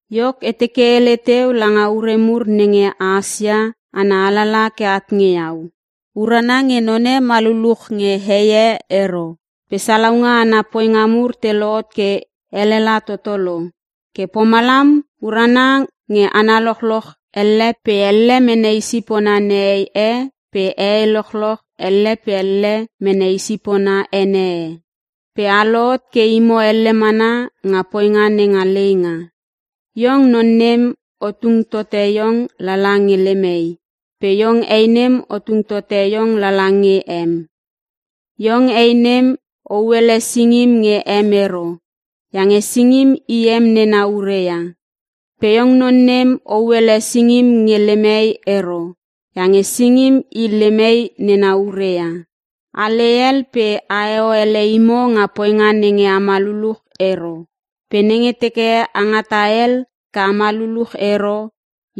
Iok, e teke e hele teu langa ure mur nenge a hasia ana alalaha ke at nge iau: Urana nge none ma luluch nge hei e ero. Pe salaunga ana poinga mur te lohot ke elela toto lo, ke pomalam urana nge hana lochloch elle pe elle mene i sipona nehei e pe hehei lochloch elle pe elle mene i sipona ene e. Pe a lohot ke imo elle mana nga poinga nenga leinga. Iong non nem o tung tote iong lala nge lem hei pe iong hei nem o tung tote iong lala nge em. Iong hei nem o huele singim nge em ero iange singim i em nena ure ia, pe iong non nem o huele singim nge lem hei ero iange singim i lem hei nena ure ia. A lei hel pe aheo ele imo nga poinga nenge ama luluch ero. Pe nenge teke a ngata hel ke ama luluch ero,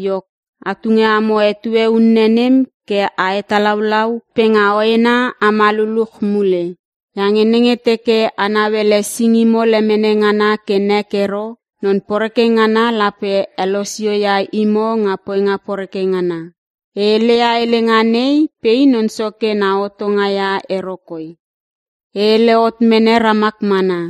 iok a tunge amo etue unne nem ke a hetalaulau pe nga hoena ama luluch mule. Iange nenge teke a nauele singimo lemene ngana ke nek ero non poreke ngana lape helosio ia imo nga poinga poreke ngana. E heleia helenga nei pe i Non Soke na hotonga ia ero koi. E hele hot mene ramak mana.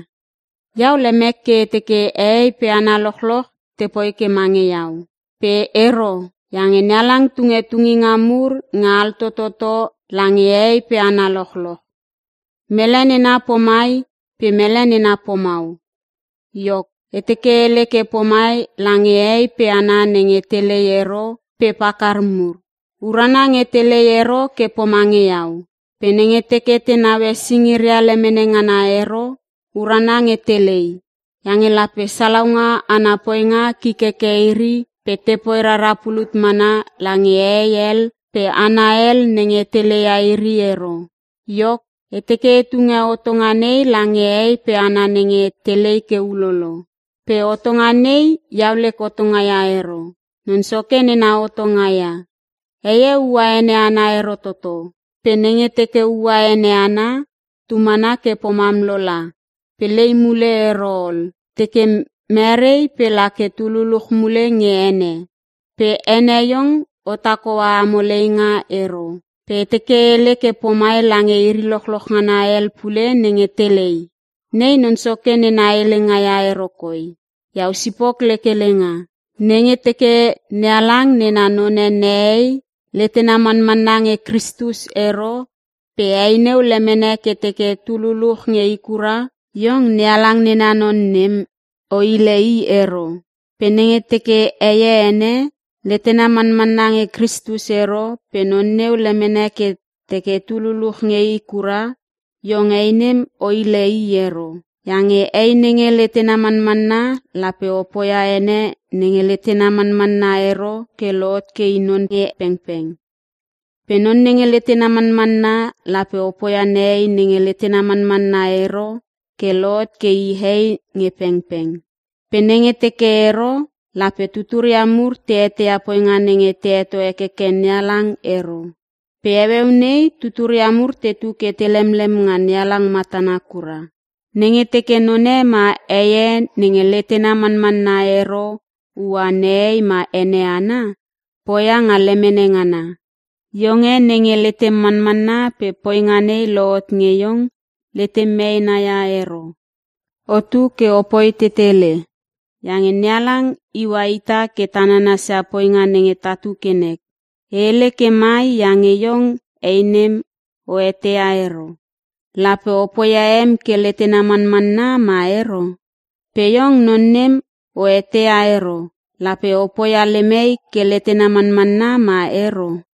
Iau lemek ke e teke hehei pe hana lochloch tepoi ke mange iau. Pe ero iange NeHalang tunge tunginga mur nge altototo lange hehei pe hana lochloch. Mele nena pomai pe mele nena pomau. Iok, e teke e hele ke pomai lange hehei pe hana nenge telei ero pe pakar mur: Urana nge telei ero ke pomange iau. Pe nenge teke te nauele singiria lemene ngana ero, urana nge telei. Iange lape salaunga ana poinga kik heke iri pe tepoi rara pulut mana lange hehei hel pe hana hel nenge te leia iri ero. Iok, e teke e tunge hotonga nei lange hehei pe hana nenge telei ke ulolo. (Pe hotonga nei iau lek hotonga ia ero, Non Soke nena hotonga ia.) Heie ua ene ana ero toto. Pe nenge teke ua ene ana, tu mana ke pomam lola pe lei mule ero ol. Teke merei pe la ke tu luluch mule nge ene. Pe ene iong otak hoa amo leinga ero. Pe e teke e hele ke pomai lange iri lochloch ngana hel pule nenge telei: (Nei Non Soke nena helenga ia ero koi, iau sipok lek helenga.) Nenge teke NeHalang nena none nehei, letena manmanna nge Kristus ero pe hei neu lemene ke teke tu luluch nge i kura, iong NeHalang nena non nem o hile i ero. Pe nenge teke heie ene, letena manmanna nge Kristus ero pe non neu lemene ke teke tu luluch nge i kura, iong hei nem o hile i ero. Iange hei nenge letena manmanna lape o poia ene nenge letena manmanna ero ke lohot ke i non pengpeng. Pe non nenge letena manmanna lape o poia nehei nenge letena manmanna ero ke lohot ke i hei nge pengpeng. Pe nenge teke ero, lape tuturia mur te eteia poinga nenge te heto hekeke NeHalang ero. Pe heueu nei tuturia mur tetu ke te lemlem nga NeHalang matana kura. Nenge teke none ma heie nenge letena manmanna ero ua nehei ma ene ana, poia nga lemene ngana. Iong e nenge letem manmanna pe poinga nei lohot nge iong, letem meena ia ero. Otu ke opoi tetele, iange NeHalang iua ita ke ta nanasia poinga nenge tatu ke tanek. E hele ke mai iange iong hei nem o eteia ero, lape o poia em ke letena manmanna ma ero. Pe iong non nem o eteia ero, lape o poia lem hei ke letena manmanna ma ero.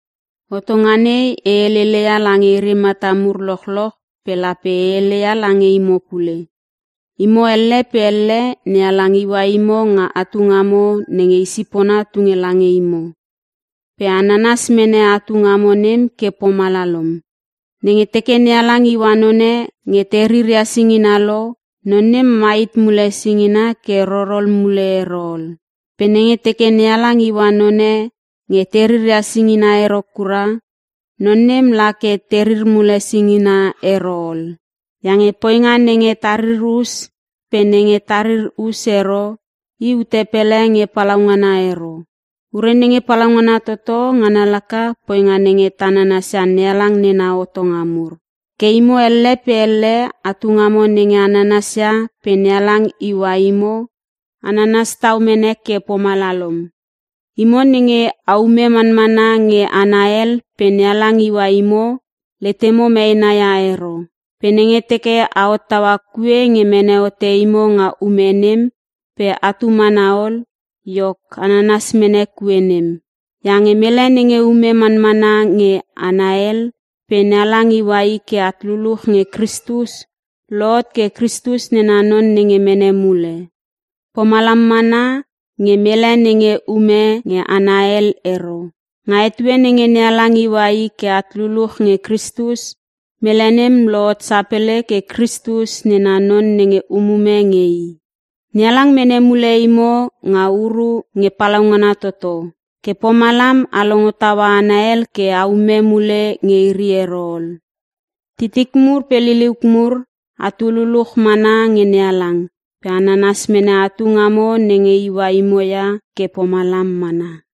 Hotonga nei e helele ia lange iri mata mur lochloch pe lape e heleia lange imo pule. Imo elle pe elle NeHalang iua imo nga atu ngamo nenge i sipona tunge lange imo, pe a nanas mene atu ngamo nem ke pomalalom. Nenge teke NeHalang iua none nge te riria singina lo, non nem mai hit mule singinga ke rorol mule ero ol. Pe nenge teke NeHalang iua none nge te riria singina ero kura, non nem la ke terir mule singina ero ol. Iange poinga nenge ta ririr us pe nenge ta ririr us ero, i ute pele nge palaungana ero. Ure nenge palaungana toto ngana laka; poinga nenge ta nanasia NeHalang nena hotonga mur. Ke imo elle pe elle atu ngamo nenge a nananas ia pe NeHalang iua imo, a nanas tau mene ke pomalalom. Imo nenge aume manmana nge hana hel pe NeHalang iua imo, letemo meena ia ero. Pe nenge teke a hottaua kue nge mene hote imo nga ume nem pe atu mana ol, iok ananas mene kue nem. Iange mele nenge ume manmana nge hana hel pe NeHalang iua i ke at luluch nge Kristus, lohot ke Kritus nena non nenge mene mule. Pomalam mana nge mele nenge ume nge hana hel ero. Nga etue nenge NeHalang iua i ke at luluch nge Kristus, mele nem lohot sapele ke Kristus nena non nenge umume nge I. NeHalang mene mule imo nga uru nge palaungana toto. Ke pomalam a longo taua hana hel ke aume mule nge iri ero ol. Titik mur pe liliuk mur, atu luluch mana nge NeHalang pe a nanas mene atu ngamo nenge iua imo ia ke pomalam mana.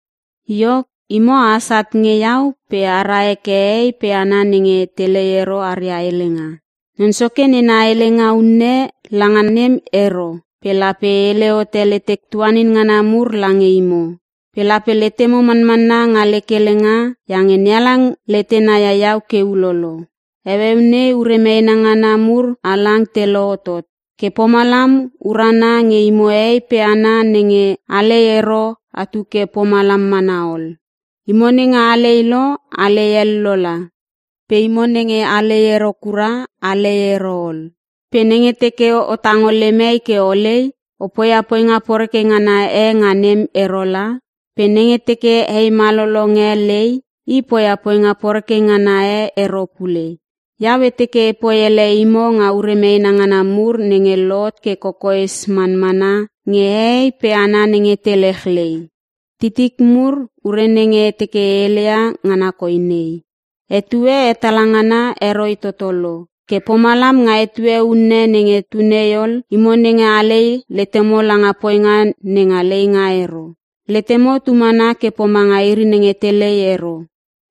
Iok, imo ahas at nge iau pe ara heke hehei pe hana nenge telei ero aria helenga. Non Soke nena helenga unne langa nem ero pe lape e hele hote letek tuanin ngana mur lange imo. Pe lape letemo manmanna nga lek helenga iange NeHalang letena ia iau ke ulolo. Heueu nei ure meena ngana mur halang te lohotot. Ke pomalam urana nge imo hehei pe hana nenge alei ero atu ke pomalam mana ol. Imo nenge alei lo alei hel lola, pe imo nenge alei ero kura alei ero ol. Pe nenge teke o tango lem hei ke olei, o poia poinga poreke ngana e nga nem ero la. Pe nenge teke hei malolong e lei, i poia poinga poreke ngana e ero pule. Iau e teke epoi ele imo nga ure meena ngana mur nenge lohot ke kokoes manmana nge hehei pe hana nenge te lechlei. Titik mur ure nenge e teke e heleia ngana koi nei; Etue hetala ngana heroi toto lo. Ke pomalam nga etue unne nenge tu nei ol, imo nenge alei letemo langa poinga nenga leinga ero. Letemo tu mana ke pomanga iri nenge telei ero.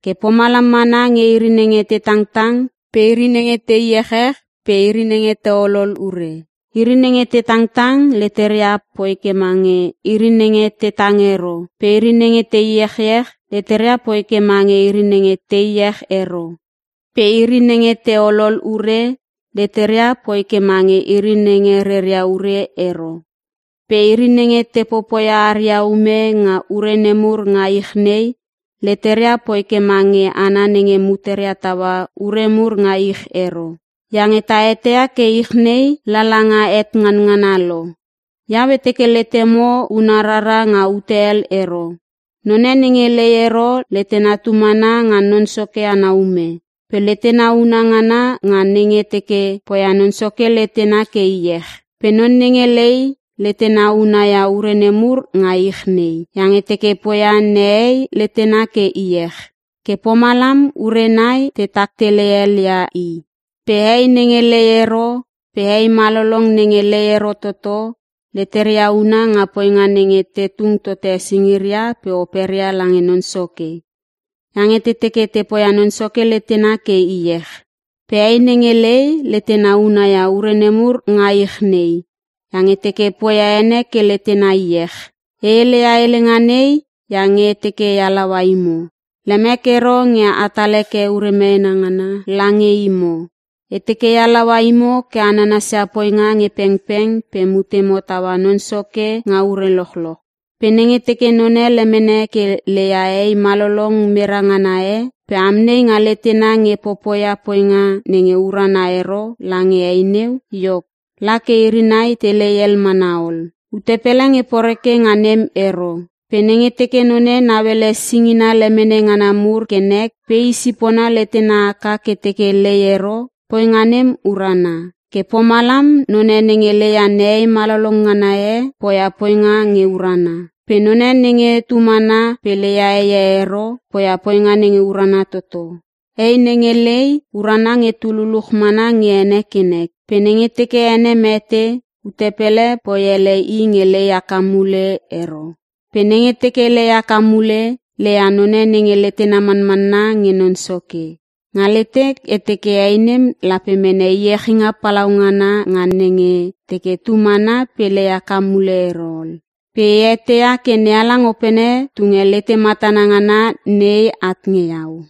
Ke pomalam mana nge iri nenge te tangtang pe iri nenge te iechech pe iri nenge te olol ure. Iri nenge te tangtang leteria poi ke mange iri nenge te tang ero pe iri nenge te iechech leteria poi ke mange iri nenge te iech ero pe iri nenge te olol ure, leteria poi ke mange iri nenge reria ure ero. Pe iri nenge te popoia aria ume nga ure nemur nga ich nei leteria poi ke mange hana nenge muteria taua ure mur nga ich ero. Iange ta eteia ke ich nei lala nga het nganngana lo. Iau e teke letemo una rara nga ute hel ero. None nenge lei ero letena tu mana nga Non Soke ana ume. Pe letena una ngana nga nenge teke poia Non Soke letena ke iech. Pe non nenge lei letena unaia ure nemur nga ich nei, iange teke poia nehei letena ke iech. Ke pomalam ure nai te taktele helia i. Pe hei nenge lei ero pe hei malolong nenge lei ero toto, leteria una nga poinga nenge te tung tote singiria pe operia lange Non Soke iange te teke te poia Non Soke letena ke iech. Pe hei nenge lei, letena una ia ure nemur nga ich nei iange teke poia ene ke letena iech. E heleia helenga nei iange e teke e halaua imo. Lemek ero nge etal heke ure meena ngana lange imo. E teke e halaua imo ke a nanasia poinga nge pengpeng pe mutemo taua Non Soke nga ure lochloch. Pe nenge teke none lemene ke leia hei malolong mera ngana e pe amnei nga letena nge popoia poinga nenge urana ero lange hei neu, iok, la ke iri nai telei hel mana ol. Ute pele nge poreke nga nem ero. Pe nenge teke none nauele singina lemene ngana mur ke nek pe i sipona letena haka ke teke lei ero, poinga nem urana. Ke pomalam none nenge leia nehei malolong ngana e poia poinga nge urana. Pe none nenge tu mana pe leia heie ero, poia poinga nenge urana toto. Hei nenge lei urana nge tu luluch mana nge ene ke nek. Pe nenge teke ene mete, ute pele poi ele i nge lei haka mule ero. Pe nenge teke lei haka mule, leia none nenge letena manmanna nge Non Soke. Nga letek e teke hei nem lape mene iechinga palaungana nga nenge teke tu mana pe lei haka mule ero ol. Pe e eteia ke NeHalang Opene tunge lete matana ngana nei at nge iau.